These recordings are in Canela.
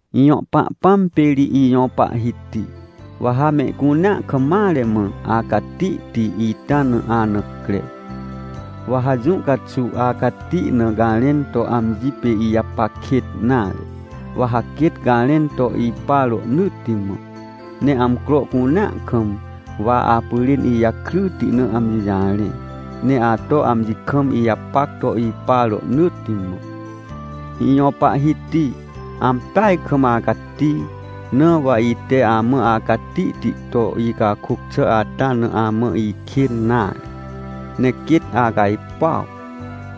Ijõ Pahpãm pê ri ijõ Pahhiti, wa ha mehcunea kam mare mã acatihti ita na ana cre! Wa ha jũ caxuw acati na garẽn to amji pê ijapac kêt nare, wa ha quêt garẽn to ipa rohnỳtti mã. Ne amcro cunea kam wa apyrên ijakryti na amji jarẽ, ne ato amji kam ijapac to ipa rohnỳtti mã. Ijõ Pahhiti, ampeaj kam acati! Na wa ite amã acatihti to icakôc xà ata na amã ihkên nare, ne quêt acajpuaw.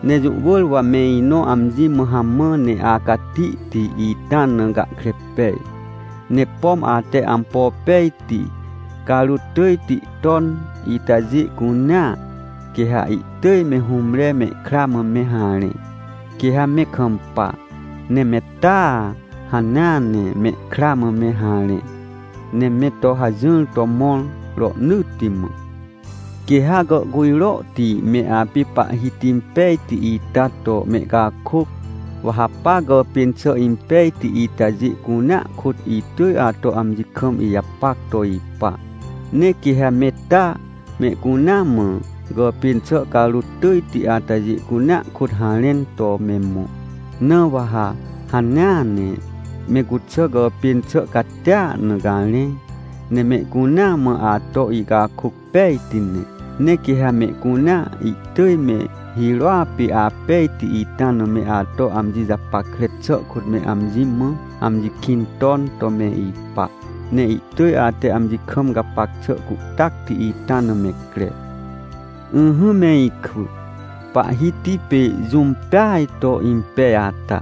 Ne jũ wỳr wa me inõ amji mã hamã ne acatihti ita na gahkre pej. Ne pom ate ampo pejti carôt tỳjti ton itajê cunea, quê ha ihtỳj me hũmre mehkra mã me harẽ, quê ha me kampa. Ne me taa, hanea ne mehkra mã me harẽ, ne me to hajỹr to mõr rohnỳtti mã. Quê ha gàhcujrohti me apê Pahhiti pejti ita to mehcakôc. Wa ha pa gàpên xà impejti itajê cunea kôt itỳj ato amji kam ijapac to ipa. Ne quê ha me taa mehcunea mã gàpên xà carôt tỳjti atajê cunea kôt harẽn to me mõ. Na wa ha hanea ne me cuxà gàpên xà catia na garẽ, ne mehcunea mã ato icakôc pejti ne. Ne quê ha mehcunea ihtỳj me hirôa pê apejti ita na me ato amji japackre xà kôt me amji mã, amji kĩn ton to me ipa. Ne ihtỳj ate amji kam gapac xà cuhtacti ita na me cre. Ỹhỹ me ikwỳ, Pahhiti pê jũm peaj to impej ata.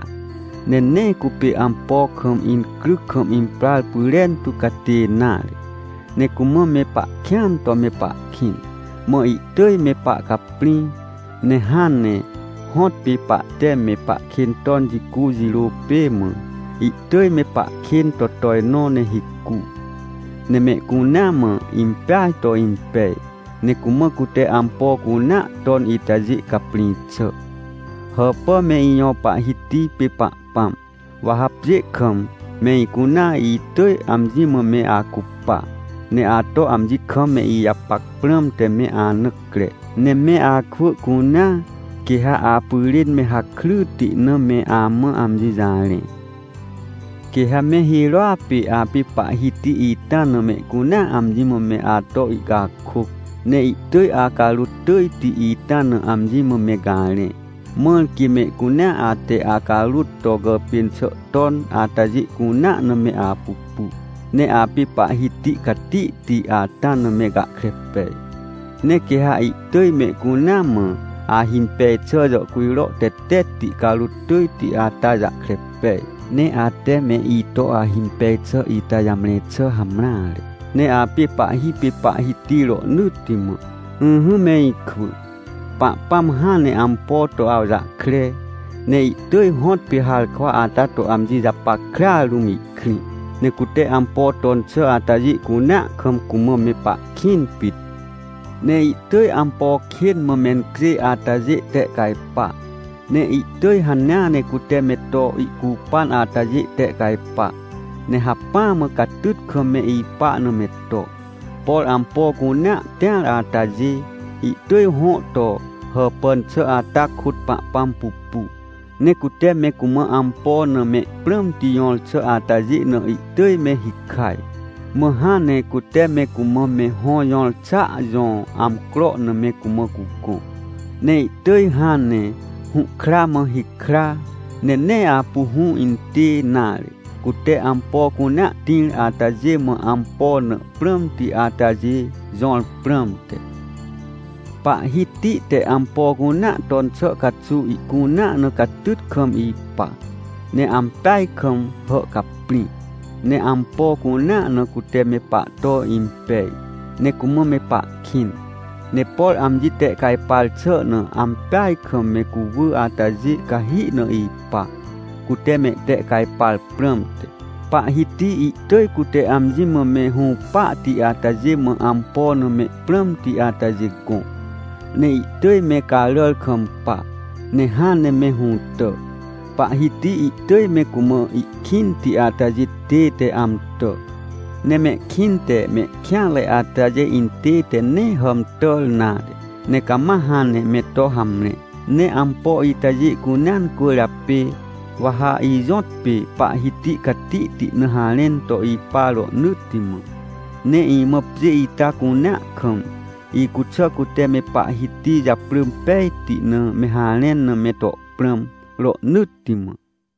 Ne nee cupê ampo kam incryc kam imprar pyrentu catê nare. Ne cumã me pahkĩan to me pahkĩn, mã ihtỳj me pahcaprĩ. Ne hãn ne hõtpê pahte me pahkên ton jicu jirô pê mã, ihtỳj me pahkên to tojnõ, ne hicu. Ne mehcunea mã impeaj to impej. Ne cumã cute ampo cunea ton itajê caprĩ xà. Hàpà me ijõ Pahhiti pê Pahpãm! Wa ha pjê kam me icunea itỳj amji mã me acupa, ne ato amji kam me ijapac prãmte me ana cre. Ne me akwỳ cunea, quê ha apyrên me hakryti na me amã amji jarẽ. Quê ha me hirôa pê apê Pahhiti ita na mehcunea amji mã me ato ihcakôc. Ne ihtỳj acarôt tỳjti ita na amji mã me garẽ. Mãr quê mehcunea ate acarôt to gàpên xà ton atajê cunea na me apupu, ne apê Pahhiti catihti ata na me gahkre pej. Ne quê ha ihtỳj mehcunea mã ahimpej xà jàhcujro tetetti carôt tỳjti ata jahkre pej. Ne ate me ito ahimpej xà ita jamre xà hamreare. Ne apê Pahhi pê Pahhiti rohnỳtti mã. Ỹhỹ me ikwỳ, Pahpãm hãn ne ampo to awjahkre, ne ihtỳj hõtpê harkwa ata to amji japackrea rũm ihkrĩ. Ne cute ampo ton xà atajê cunea kam, cumã me pahkĩn pit. Ne ihtỳj ampo kên mã mencjêj atajê tehcajpa, ne ihtỳj hanea ne cute me to ihcupan atajê tehcajpa, ne hacpỹa mã catyt kam me ipa na me to. Por ampo cunea tĩar atajê, ihtỳj hõ to hàpàn xà ata kôt Pahpãm pupu. Ne cute me cumã ampo na me prãmti jõr xà atajê na ihtỳj me hikaj. Mã hãn ne cute me cumã me hõ jõr xàa jõ amcro na me cumã cugõ. Ne ihtỳj hãn ne hũhkra mã hikra, ne nee apu hũ intê nare, cute ampo cunea tĩr atajê mã ampo na prãmti atajê jõr prãmte. Pahhiti te ampo cunea ton xà caxuw ihcunea na catyt kam ipa, ne ampeaj kam hàhcaprĩ. Ne ampo cunea na cute me pahto impej, ne cumã me pahkĩn. Ne por amji tehcajpar xà na ampeaj kam me cuwỳ atajê cahi na ipa, cute mehtehcajpar prãmte. Pahhiti ihtỳj cute amji mã me hũpahti atajê mã ampo na me prãmti atajê gõ. Ne ihtỳj me caràr kampa, ne hãn ne me hũtà. Pahhiti ihtỳj me cumã ihkĩnti atajê tête amtà, ne mehkĩnte mehkêanre atajê intête nee hàmtàr nare, ne cama hãn ne me to hamre. Ne ampo itajê cunea cwỳrjapê, wa ha ijõtpê Pahhiti catihti na harẽn to ipa rohnỳtti mã. Ne imã pjê ita cunea kam, icuxà cute me Pahhiti japrỳ pejti na me harẽn na me to prãm rohnỳtti mã.